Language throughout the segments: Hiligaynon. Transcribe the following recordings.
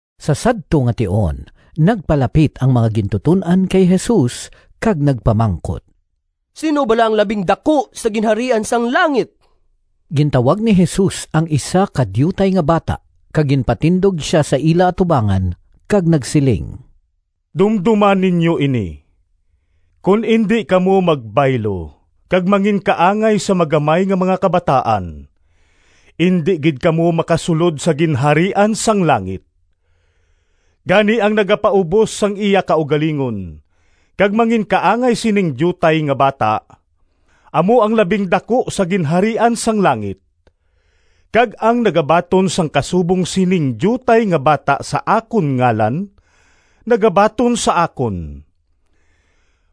Sa sadto nga tion nagpalapit ang mga gintuton-an kay Jesus kag nagpamangkot, “Sin-o bala ang labing daku sa Ginharian sang langit?” Gintawag ni Jesus ang isa ka diutay nga bata kag ginpatindog sia sa ila atubangan, kag nagsiling, “Dumdoma ninyo ini! Kon indi kamo magbaylo kag manginkaangay sa magamay nga mga kabataan, indi gid kamo makasulod sa Ginharian sang langit. Gani ang nagapaubos sang iya kaugalingon kag manginkaangay sining diutay nga bata, amo ang labing daku sa Ginharian sang langit. Kag ang nagabaton sang kasubong sining diutay nga bata sa akon ngalan nagabaton sa akon.”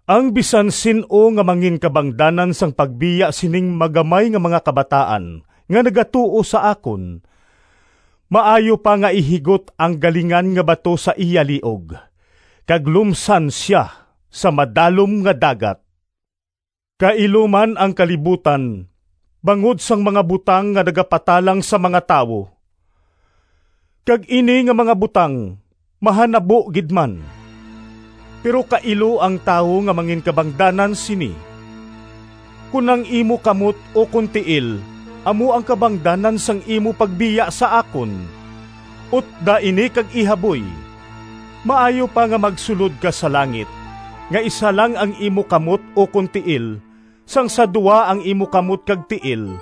“Ang bisan sin-o nga manginkabangdanan sang pagbiya sining magamay nga mga kabataan nga nagatuo sa akon, maayo pa nga ihigot ang galingan nga bato sa iya liog kag lumsan sia sa madalom nga dagat. Kailo man ang kalibutan bangod sang mga butang nga nagapatalang sa mga tawo! Kag ini nga mga butang mahanabo gid man. Pero kailo ang tawo nga manginkabangdanan sini! “Kon ang imo kamot ukon tiil amo ang kabangdanan sang imo pagbiya sa akon, utda ini kag ihaboy! Maayo pa nga magsulod ka sa langit nga isa lang ang imo kamot ukon tiil sang sa duha ang imo kamot kag tiil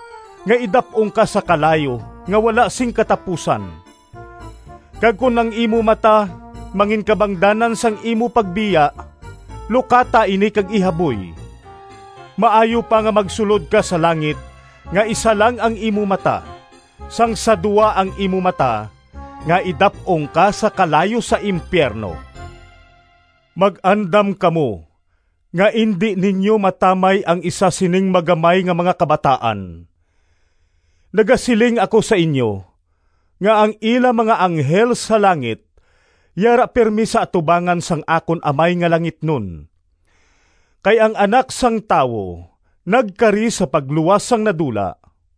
nga idap-ong ka sa kalayo nga wala sing katapusan. Kag kon ang imo mata manginkabangdanan sang imo pagbiya, lukata ini kag ihaboy! Maayo pa nga magsulod ka sa langit nga isa lang ang imo mata sang sa duha ang imo mata nga idap-ong ka sa kalayo sa impiyerno.” “Mag-andam kamo nga indi ninyo matamay ang isa sining magamay nga mga kabataan. Nagasiling ako sa inyo nga ang ila mga anghel sa langit yara pirme sa atubangan sang akon Amay nga langitnon. [ Kay ang Anak sang Tawo nagkari sa pagluwas sang nadula.]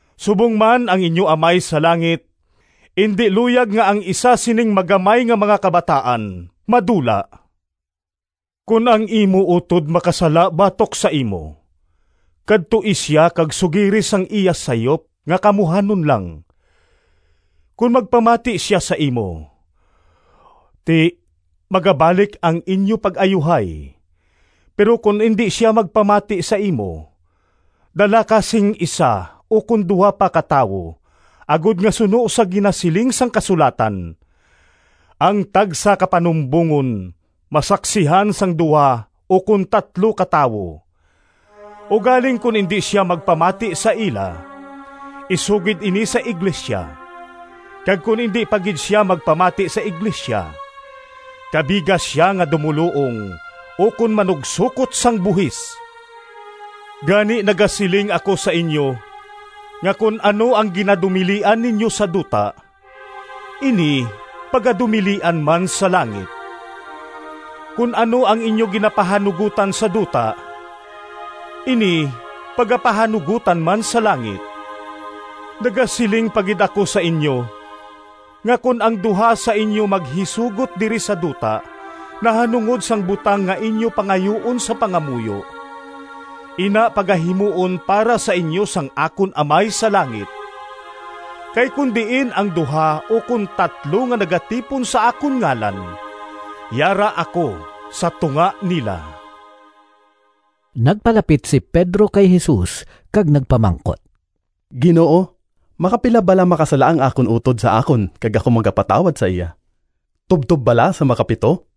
Subong man ang inyo Amay sa langit indi luyag nga ang isa sining magamay nga mga kabataan madula.” “Kon ang imo utod makasala batok sa imo, kadtoi sia kag sugiri sang iya sayop nga kamuhanon lang. Kon magpamati sia sa imo, ti magabalik ang inyo pag-ayuhay. Pero kon indi sia magpamati sa imo, dala ka sing isa ukon duha pa ka tawo agod nga suno sa ginasiling sang kasulatan, ‘Ang tagsa ka panumbongon masaksihan sang duha ukon tatlo ka tawo.’ Ugaling kon indi sia magpamati sa ila, isugid ini sa iglesia. Kag kon indi pa gid sia magpamati sa iglesia kabiga sia nga dumoluong ukon manugsokot sang buhis.” “Gani nagasiling ako sa inyo nga kon ano ang ginadumilian ninyo sa duta, ini pagadumilian man sa langit. Kon ano ang inyo ginapahanugotan sa duta, ini pagapahanugotan man sa langit. “Nagasiling pa gid ako sa inyo, nga kon ang duha sa inyo maghisugot diri sa duta nahanungod sang butang nga inyo pangayuon sa pangamuyo, ina pagahimuon para sa inyo sang akon Amay sa langit. Kay kon diin ang duha ukon tatlo nga nagatipon sa akon ngalan, yara ako sa tunga nila.” Nagpalapit si Pedro kay Jesus kag nagpamangkot, “Ginoo, makapila bala makasala ang akon utod sa akon kag ako magapatawad sa iya? Tubtob bala sa makapito?”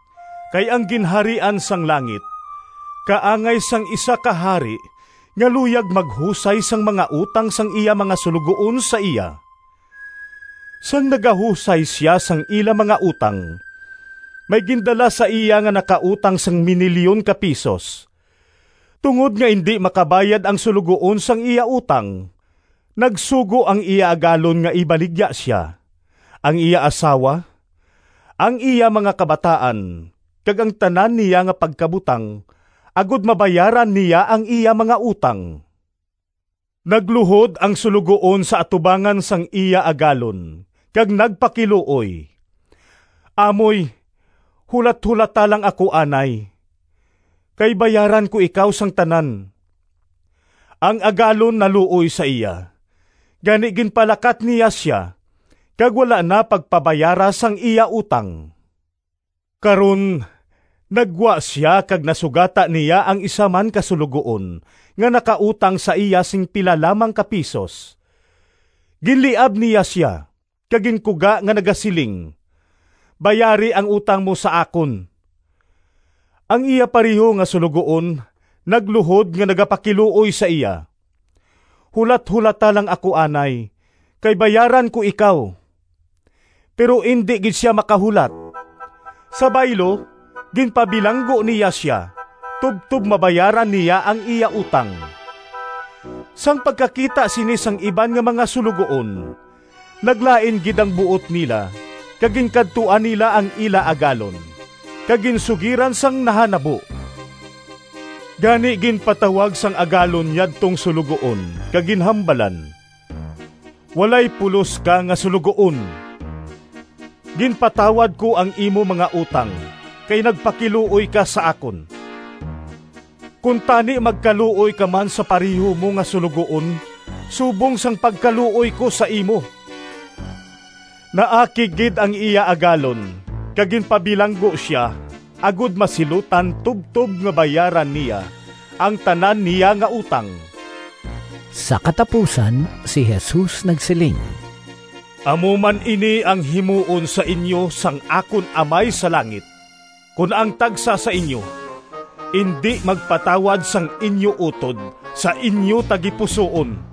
Kay ang Ginharian sang langit kaangay sang isa ka hari nga luyag maghusay sang mga utang sang iya mga suloguon sa iya. Sang nagahusay sia sang ila mga utang, may gindala sa iya nga nakautang sing minilyon ka pisos. Tungod nga indi makabayad ang suloguon sang iya utang, nagsugo ang iya agalon nga ibaligya sia, ang iya asawa, ang iya mga kabataan kag ang tanan niya nga pagkabutang agod mabayaran niya ang iya mga utang. Nagluhod ang suloguon sa atubangan sang iya agalon kag nagpakiluoy, ‘Amoy, hulatholata lang ako anay, kay bayaran ko ikaw sang tanan!’ Ang agalon naluoy sa iya, gani ginpalakat niya sia kag wala na pagpabayara sang iya utang. “Karon naggwa sia kag nasugata niya ang isa man ka suloguon nga nakautang sa iya sing pila lamang ka pisos. Ginliab niya sia kag ginkuga nga nagasiling, ‘Bayari ang utang mo sa akon!’ Ang iya pareho nga suloguon nagluhod nga nagapakiluoy sa iya, ‘Hulatholata lang ako anay, kay bayaran ko ikaw!’ Pero indi gid sia makahulat. Sa baylo ginpabilanggo niya sia tubtob mabayaran niya ang iya utang. Sang pagkakita sini sang iban nga mga suloguon, naglain gid ang buot nila kag ginkadtuan nila ang ila agalon kag ginsugiran sang nahanabo. Gani ginpatawag sang agalon yadtong suloguon kag ginhambalan, ‘Walay pulos ka nga suloguon! Ginpatawad ko ang imo mga utang kay nagpakiluoy ka sa akon. Kuntani magkaluoy ka man sa pareho mo nga suloguon subong sang pagkaluoy ko sa imo.’ Naakig gid ang iya agalon kag ginpabilanggo sia agod masilutan tubtob nga bayaran niya ang tanan niya nga utang.” Sa katapusan si Jesus nagsiling, “Amo man ini ang himuon sa inyo sang akon Amay sa langit kon ang tagsa sa inyo indi magpatawad sang inyo utod sa inyo tagipusoon.”